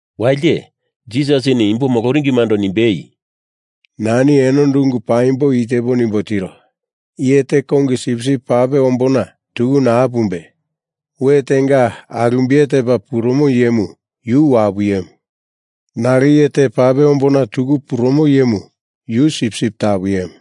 Walite Jisasini imbo moloringimando nimbei, “Nani enondo ungu paimbo i tepo nimbo tiro. Iye te kongi sipsip pape ombona tuku naa pumbe, we tenga alumbiye tepa purumo iyemu yu wapu iyemu. Nalo iye te pape ombona tuku purumo iyemu yu sipsip tapu iyemu.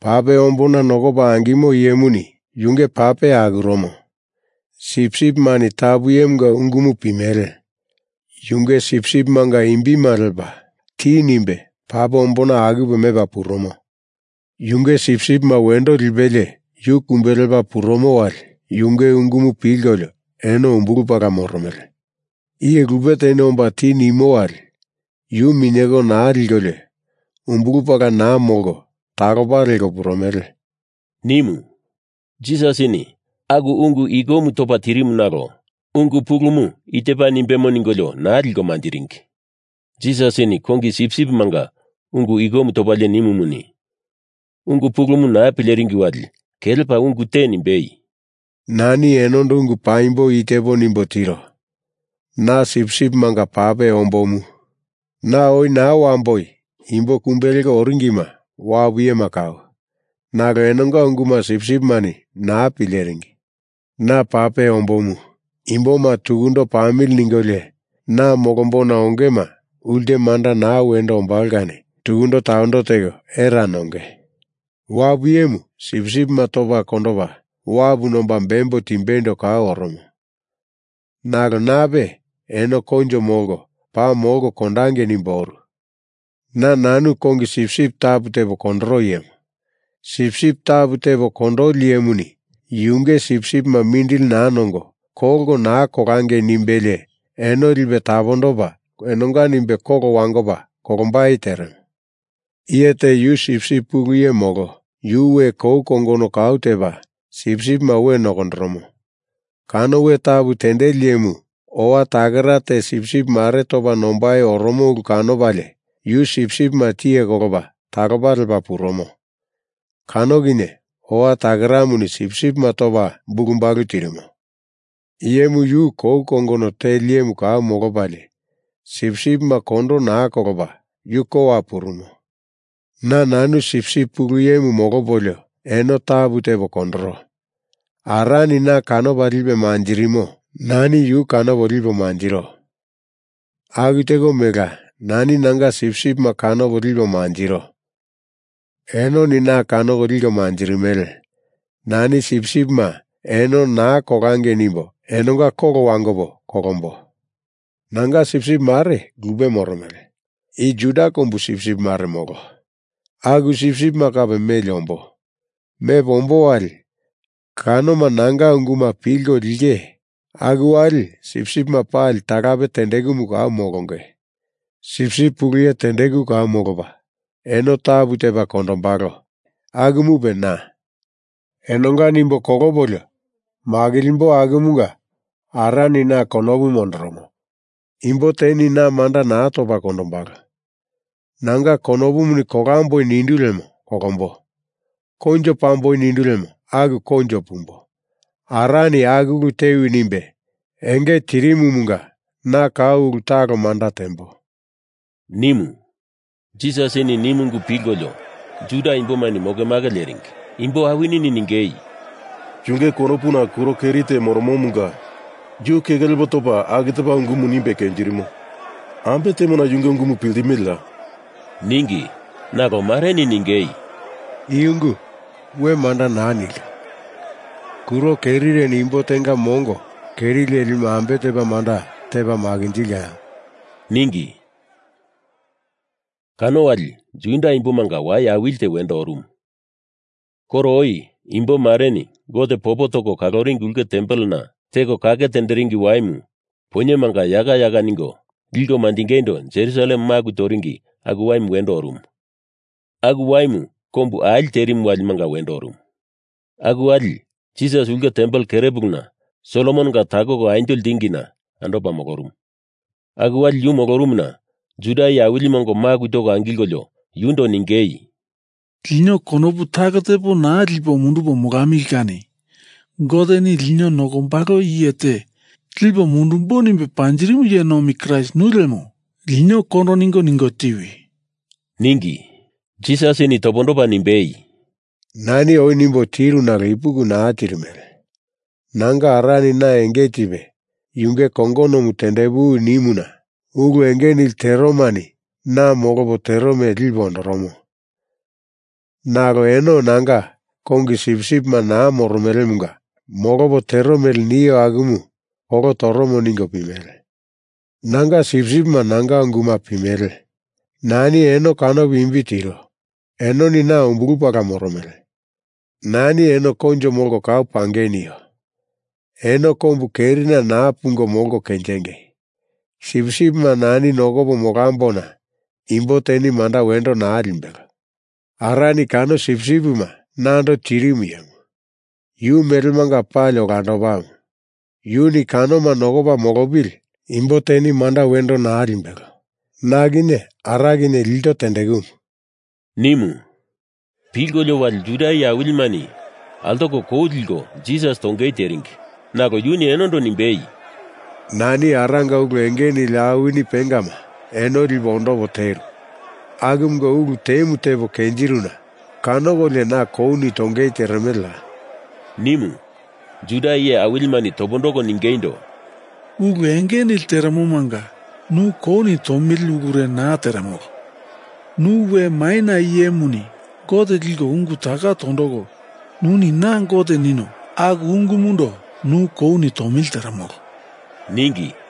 Pape ombona nokopa angimo iyemuni yunge pape akuromo. Sipsipimani tapu iyemunga ungumu pimele. Yunge sipsipimanga imbima lepa ti nimbe pape ombona akupe mepa purumo. Yunge sipsipima wendo lipelie, yu kumbe lepa purumo wali yunge ungumu pilkolio eno umbulu pala moromele. Iye lupe teni omba ti nimo wali yu minyeko naa likolio umbulu pala naa molko talopa leko purumele,” nimu. Jisasini aku ungu ikomu topa tirimu nalo ungu pulumu i tepa nimbemo ningolio naa liko manjiringi. Jisasini kongi sipsipimanga ungu ikomu topalie nimumuni, ungu pulumu naa pileringi wali kelepa ungu te nimbei, “Nani enondo ungu paimbo i tepo nimbo tiro. Na sipsipimanga pape ombomu. Na oi naa wamboi imbo kumbe leko oringima wapu iyema kau, nalo enonga unguma sipsipimani naa pileringi. Na pape ombomu. Imboma tukundo pamili ningolio na molombona ongema ulte manda naa wendo ombalo kani tukundo tawendo teko era nonge. Wapu iyemu sipsipima topa kondopa wapu nomba bembo timbeindo kau oromo. Nalo nape eno koinjo molko paa molko kondangei nimbo oru. Na nanu kongi sipsip tapu tepo kondoro iyemu. Sipsip tapu tepa kondoli iyemuni yunge sipsipima mindili naa nongo, kolko naa kolangei nimbelie eno lipe tapondopa enonga nimbe kolo wangopa kolombai teremo. Iye te yu sipsip pulu iye molo, yu we kou kongono kau tepa sipsipima we nokondoromo. Kano we tapu tendeli iyemu owa takera te sipsip mare topa nombai oromo ulu kanopalie, yu sipsipima tiye kolopa talopa lepa purumo. Kano kinye owa takeramuni sipsipima topa bulubalu tirimo. Iyemu yu kou kongono teli iyemu kau molopalie, sipsipima kondo naa kolopa yu kowa purumo. Na nanu sipsip pulu iyemu molopolio eno tapu tepo kondoro. Arani na kanopa lipe manjirimo nani yu kanopo lipo manjiro. Aku teko melela nani nanga sipsipima kanopo lipo manjiro enoni na kanoko liko manjirimele. Nani sipsipima eno naa kolangei nimbo enonga kolo wangopo kolombo. Nanga sipsip mare lupe moromele, i Juda kombu sipsip mare molo. Aku sipsipima kape meli ombo. Mepo ombo wali kanoma nanga unguma pilko linge aku wali sipsipima pali talape tendekumu kau molonge. Sipsip pulu iye tendeku kau molopa eno tapu tepa kondombalo. Akumupe na. Enonga nimbe kolopolio makilimbo akumunga Arani na konopu mondoromo. Imbo teni na manda naa topa kondombalo. Nanga konopumuni kolamboi nindu lemo kolombo. Koinjo pamboi nindu lemo aku koinjo pumbo. Arani aku ulu tewi nimbe enge tirimumunga na kau ulu talo manda tembo,” nimu. Jisasini nimu ungu pilkolio Juda imbomani mokemake leringi. Imbo awinini ningei, “Yunge konopuna kuro keri te moromomunga yu keke lepo topa aku tepa ungumu nimbe kenjirimo. Ambe temona yunge ungumu piltimeleya?” ningi. Nalo mareni ningei, “I ungu we manda naa nilka. Kuro kerireni imbo tenga mongo keri lelimu ambe tepa manda tepa makinjilkaya?” ningi. Kano wali Juda imbomanga wai awili te wendo orumu. Koro oi imbo mareni Gote popo toko kaloringi Ulke Tempelena Teko Kake Tenderingi Waimu poinyemanga yaka yaka ningo liko manjingeindo Jerusalem maku toringi aku Waimu wendo orumu. Aku Waimu kombu ali terimu walimanga wendo orumu. Aku wali Jisas ulke tempel kerepuluna Solomononga takoko anjo ltingina andopa molorumu Aku wali yu molorumuna Juda iye awilima ongo maku toko angilkolio yundo ningei, “Lino konopu talo tepo naa lipo mundupo molamili kani Goteni lino nokombalo iye te lipo mundumbo nimbe panjirimu iye nomi Kraist nu lemo, lino kondo ningo tiwi,” ningi. Jisasini topondopa nimbei, “Nani oi nimbo tiru nalo ipuki naa tirimele. Nanga Arani na enge tipe yunge kongonomu tendepuwi nimuna ulu enge nili teromani na molopo tero mele lipe ondoromo, nalo eno nanga kongi sipsipima naa moromelemunga molopo tero mele nio akumu kolo toromo ningo pimele. Nanga sipsipima nanga unguma pimele. Nani eno kanopo imbi tiro, enoni na umbulu pala moromele. Nani eno koinjo molko kau pangei nio, eno kombu kerina naa pungo molko kenjinge. Sipsipima nani nokopo molambona imbo teni manda wendo naa limbelo. Arani kano sipsipima nando tirimu iyemu, yu melemanga pali olandopamu. Yuni kanoma nokopa molopili, imbo teni manda wendo naa limbelo. Na kinye Ara kinye ilto tendekumu,” nimu. Pilkolio wali Juda iye awilimani altoko kou liko Jisas tongei teringi, nalo yuni enondo nimbei, “Nani Aranga ulu enge nili awini pengama eno lipo ondopo teru, akumanga ulu temu tepo kenjiruna kanokolio na kouni tongei teremeleya?” nimu. Juda iye awilimani topondoko ningeindo, “Ulu enge nili terenomanga nu kouni tomili ulure naa teremolo. Nu we maina iyemuni Gote liko ungu taka tondoko nuni Na Gote nino, aku ungumundo nu kouni tomili teremolo,” ningi.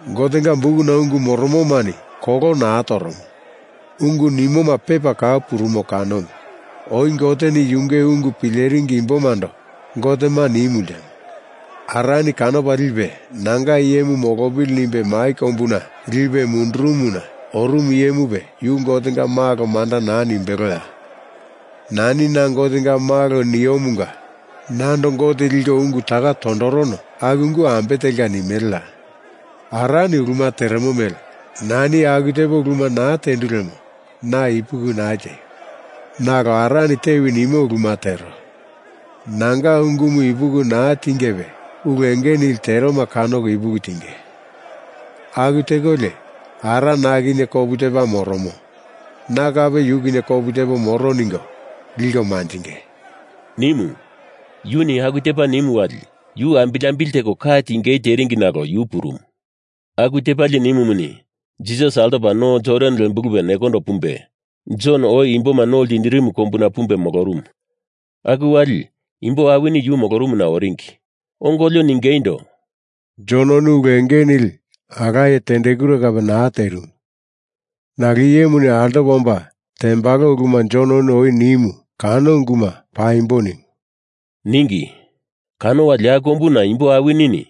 Gotenga bukuna ungu moromomani kolo naa toromo, ungu nimoma pepa kau purumo kanomu. Oi Goteni yunge ungu pileringi imbomando gotema nimu ltemo. Arani kanopo lipe nanga iyemu molopili nimbe mai kombuna lipe mundurumuna orumu iyemupe yu Gotenga Malo manda naa nimbeloya? Nani na Gotenga Malo niomunga nando Gote liko ungu taka tondorono aku ungu ambe telka nimeleya? Arani uluma teremo mele nani aku tepo uluma naa tendu lemo na ipuki naa tieio! Nalo Arani tewi nimo uluma tero. Nanga ungumu ipuki naa tingepe ulu enge nili teroma kanoko ipuki tinge. Aku tekolio Ara na kinye kopu tepa moromo, na kape yu kinye kopu tepo moro ningo liko manjinge,” nimu Yuni aku tepa nimu wali yu ambili ambili teko ka tingei teringi nalo yu purumu. Aku tepalie nimumuni, Jisas altopa no Jordan lembulupe nekondo pumbe, Jon oi imboma no ltindirimu kombuna pumbe molorumu. Aku wali imbo awini yu molorumuna oringi. Ongolio ningeindo, “Jononi ulu enge nili alaye tendekure kape naa terimu, nalo iyemuni altopa omba tembalo uluma Jononi oi nimu kano unguma paimbo nimu,” ningi. Kano wali aku kombuna imbo awinini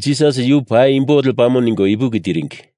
Jisas yu paimbo lepamo ningo ipuki tiringi.